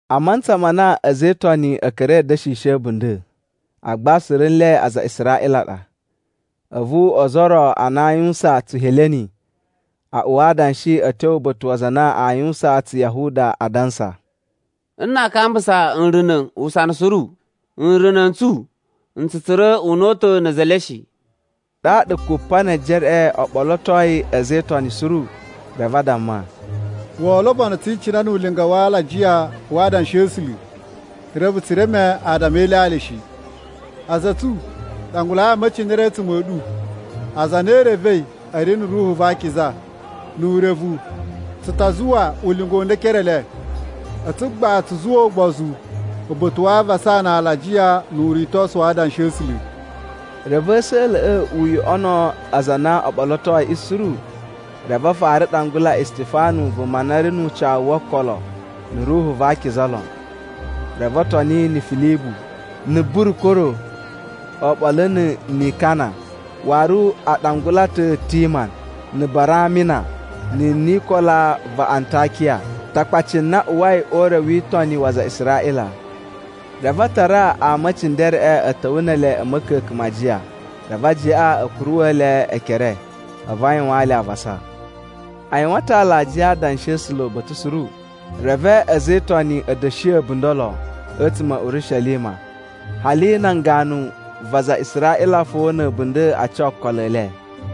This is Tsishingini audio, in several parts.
A mantsa ma na a̱za̱ e Itoni a̱ ka̱ra̱i a̱ da̱shishi a̱bunda̱, agba suru nle aza a Israꞌila a ɗa. A̱vu ozo o ro a na a yuwusan Tsuheleni a uwa adanshi a̱ tyo uba̱ta̱ wa aza a na a yuwusan Tsuyahuda, adansa, “Nna a kambusa nruna̱ usana suru, nruna̱ n tsu n tsu tsura̱ una̱ta̱ na̱ a̱za̱ e le shi.” Ɗaɗa Kupanejereꞌe o ɓolotoi a̱za̱ e Itoni suru, reve a damma, “Woo lobono tsi icinai nu ulinga wa alajiya wa adanshi a̱ A̱sula̱, reve tsu reme adama e ilyalya shi. A̱za̱ a̱ tsu, ɗangulai ama e cindere a̱tsuma̱ a̱ ɗu, aza a na i revei a̱ ri na̱ Ruhu va Akiza, nu urevu, tsu ta zuwa ulinga u nda e ekere e le. A̱tsu gbaꞌa tsu zuwa ugbozu uba̱ta̱ wa avasa na alajiya nu uritosu wa adanshi a̱ A̱sula̱.” Reve a̱sa̱la̱ꞌa̱ u yoꞌono aza a na o ɓolotoiꞌi suru. Reve a fara ɗangula Istifanu vuma na ri nu ucawu wo okolo na̱ Ruhu va Akiza lon. Reve o toni na̱ Filibu, na̱ Burukoro, oɓolo na̱ Nikana, waru a ɗangula ta̱ Timan, na̱ Baramina, na̱ Nikola va Antakiya, Takpaci na uwai o ure wi itoni wa aza a Israꞌila. Reve a tara ama e cindereꞌe a̱ ta̱wa̱ ne ele a̱ ma̱ka̱ka̱n ma ajiya, reve ajiyaꞌa a̱ kuruwa̱ le ekere a̱vu a yuwaan le avasa. A yuwan ta̱ alajiya a adanshi a̱ A̱sula̱ uba̱ta̱ suru. Reve a̱za̱ e Itoni a̱ da̱shi a̱bunda̱ lon a̱tsuma̱ a̱ Urishelima, hali nan ganu va aza a Israꞌila fo na̱ a̱bunda̱ a ca okolo e le.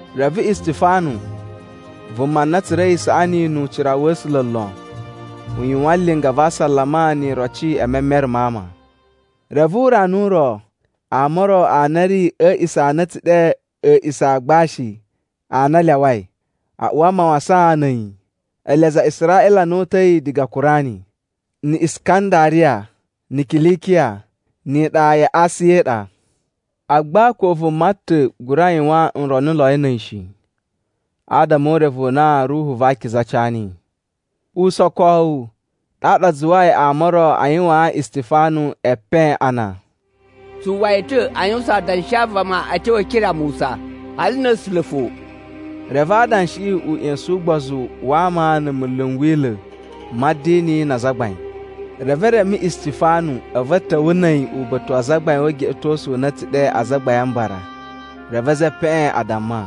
Reve Istifanu, vuma na tsura̱i isaꞌani nu ucira wa̱ A̱sula̱ lon, u yuwan linga va asalama ni iroci e memere ma ama. Reve urana u ro ama o ro a na a̱ ri a̱ a̱a̱ꞌisa̱ a na a̱ tsu ɗe A̱a̱ꞌisa̱ a Agbashi a na a Lyawai, a uwa mawasan na̱ a̱yi. Ele aza a Israꞌila a na o uta̱i diga Kurani, na̱ Iskandariya, na̱ Kilikiya, ni iɗa ya Asiya i ɗa. Agba ko vuma ta̱ gura yuwan nronuloi na̱ a̱yi shi, adama o urevu u na Ruhu va Akiza ca niyi. Usokowu ɗaɗa a zuwai ama o ro a yuwaan Istifanu epen ana, “Tsu uwwa yi ta̱ a yuwusan adanshi a vama a̱ tyo e ekere a Musa, hali na̱ A̱sula̱ fo.” Reve adanshiꞌi u ꞌya̱sa̱n ugbozu wa ama na̱ munlu n Wila̱ ma̱ a̱dini na azagbain. Reve e reme Istifanu a̱vu a̱ ta̱wa̱ na̱ a̱yi uba̱ta̱ wa azagbain o ugeꞌetosu u na a̱ tsu ɗe Azagbain a Mbara. Reve a̱za̱ e epeꞌen a damma,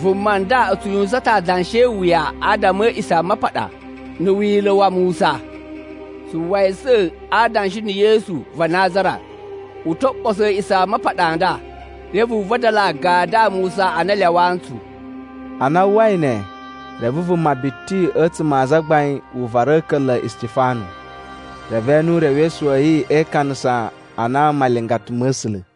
“Vuma nda u tsu yuwusan ta̱ adanshi e iwuya adama a̱ A̱a̱ꞌisamapaɗa na̱ Wila̱ wa Musa. Tsu uwwa yi ta̱ adansa a na Yesu va Nazara u to ɓoso A̱a̱ꞌisamapaɗa a nda reve u vadala agadu a Musa a na a lyawaa ntsu.” Ana a uwwai ne, reve vuma biti a̱tsuma̱ a azagbain u vara a̱ka̱nla̱ a Istifanu, reve e ene urewesu wa̱ yi e ikanasa ana malingata ma̱ A̱sula̱.